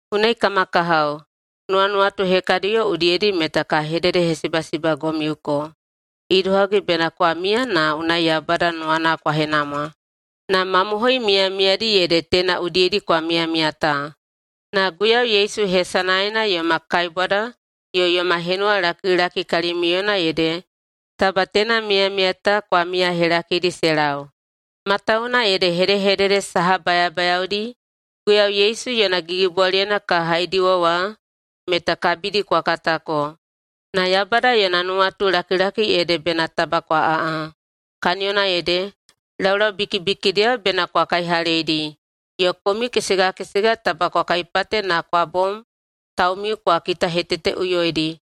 Unai, kama kahao, nuwanuwatu hekadiyo udiyedi meta ka hededehesibasibagomiuko idohagi bena kwa miya na unai Yaubada nuwana kwa henamwa. Na mamohoi miyamiyadi ede teina udiyedi kwa miyamiya ta. Na Guiyau Yesu hesanaena yoma kaibwada yo yoma henuwalakilaki kalimiuyena ede taba teina miyamiya ta kwa miyahelakidi se lau. Matawuwuna ede hedehedede saha bayabayaodi Guiyau Yesu yona gigibwaliyena ka haidiwa wa meta kabidi kwa katako. Na Yaubada yona nuwatulakilaki ede bena taba kwa aꞌa, kaniyona ede, laulau bikibikidiyao bena kwa kaihaleidi, yo komiu kesegakesega taba kwa kaipate na kwa bom taumiu kwa kitaheteteꞌuyoidi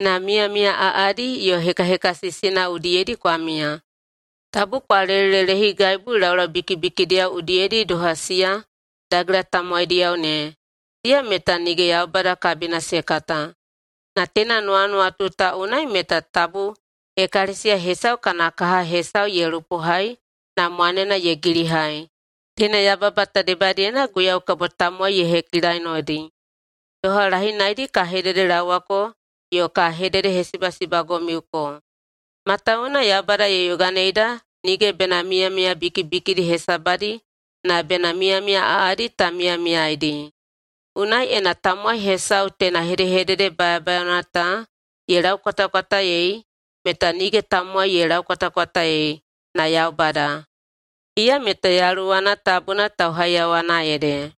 na miyamiya aꞌadi yo hekahekasisina udiyedi kwa miya. Tabu kwa lelelelehigaibu laulau bikibikidiyao udiyedi doha siya dagela tamowaidiyao ne, siya meta nige Yaubada kabina se kata. Na teina nuwanuwatu ta unai meta tabu ekalesiya hesau kana kaha hesau ye lupohai na mwanena ye gilihai. Teina yababa ta debadiyena Guiyau kabo tamowai ye hekilainodi, doha lahinaidi ka hededelaowako yo ka hededehesibasibagomiuko. Matawuwuna Yaubada ye yoganeida nige bena miyamiya bikibikidi hesabadi na bena miyamiya aꞌadi ta miyamiyaeidi. Unai, ena tamowai hesau teina hedehedede bayabayaona ta ye laukwatakwataei meta nige tamowai ye laukwatakwataei na Yaubada, iya meta Yaluwana Tabuna tauhaiyawana ede.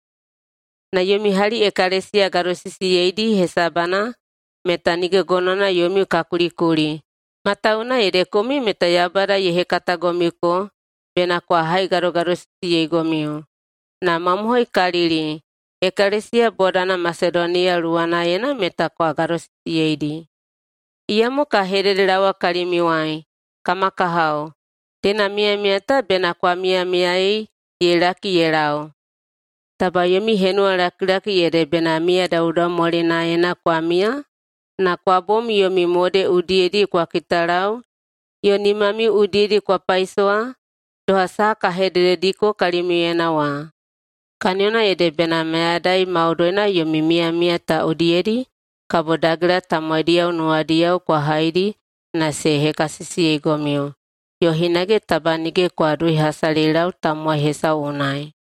Na yomi hali ekalesiya gadosisiyeidi hesabana meta nige gonowana yomiu ka kulikuli, matawuwuna ede komiu meta Yaubada ye hekatagomiuko bena kwa haigadogadosisiyeigomiu. Na mamohoikalili, ekalesiya bodana Masedoniya luwanaena meta kwa gadosisiyeidi. Iyamo ka hededelaowa kalimiuwai, kama kahao, teina miyamiya ta bena kwa miyamiyaei ye laki ye lau. Taba yomi henuwalakilaki ede bena miya daudaumwalinaena kwa miya na kwa bom yomi mode udiyedi kwa kitalau yo nimamiu udiyedi kwa paisowa doha saha ka hededediko kalimiuyena wa. Kaniyona ede bena mayadai maudoina yomi miyamiya ta udiyedi kabo dagela tamowaidiyao nuwadiyao kwa haidi na se hekasisiyeigomiu, yo hinage taba nige kwa duihasalilau tamowai hesau unai.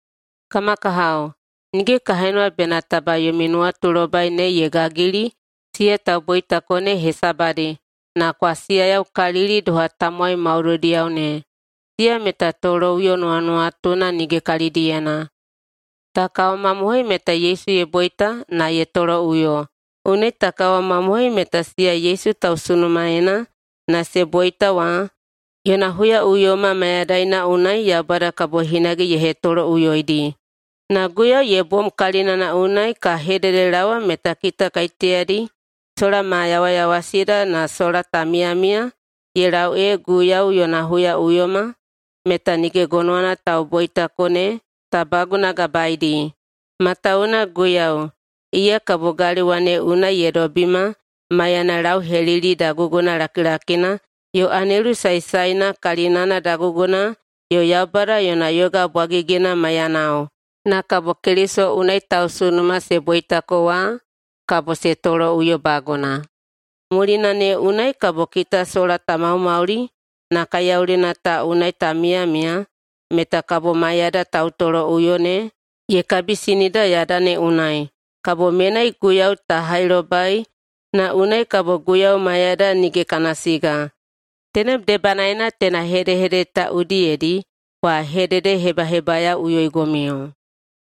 Kama kahao, nige ka henuwa bena taba yomi nuwatulobai ne ye gagili siya tauboitako ne hesabadi na kwa siyayaukalili doha tamowai maudoidiyao ne, siya meta toloꞌuyo nuwanuwatuna nige kalidiyena. Ta kawamamohoi meta Yesu ye boita na ye toloꞌuyo, unai ta kawamamohoi meta siya Yesu tausunumaena na se boita wa, yona huyaꞌuyoma mayadaina unai Yaubada kabo hinage ye hetoloꞌuyoidi. Na Guiyau ye bom kalinana unai ka hededelaowa meta kita kaiteyadi sola ma yawayawasida na sola ta miyamiya ye lau ee Guiyau yona huyaꞌuyoma, meta nige gonowana tauboitako ne ta bagunagabaeidi. Matawuwuna Guiyau, iya kabo galewa ne unai ye dobima maiyana lauhelili daguguna lakilakina yo anelu saesaena kalinana daguguna yo Yaubada yona yoga bwagigina maiyanao, na kabo Keliso unai tausunuma se boitako wa kabo se toloꞌuyobaguna. Mulina ne unai kabo kita sola ta maumauli na kaiyaulina ta unai ta miyamiya meta kabo maiyada tautoloꞌuyo ne ye kabisinida yada ne unai, kabo menai Guiyau ta hailobai na unai kabo Guiyau maiyada nige kana siga. Tenem debanaena teina hedehedede ta udiyedi kwa hededehebahebayaoꞌuyoigomiu.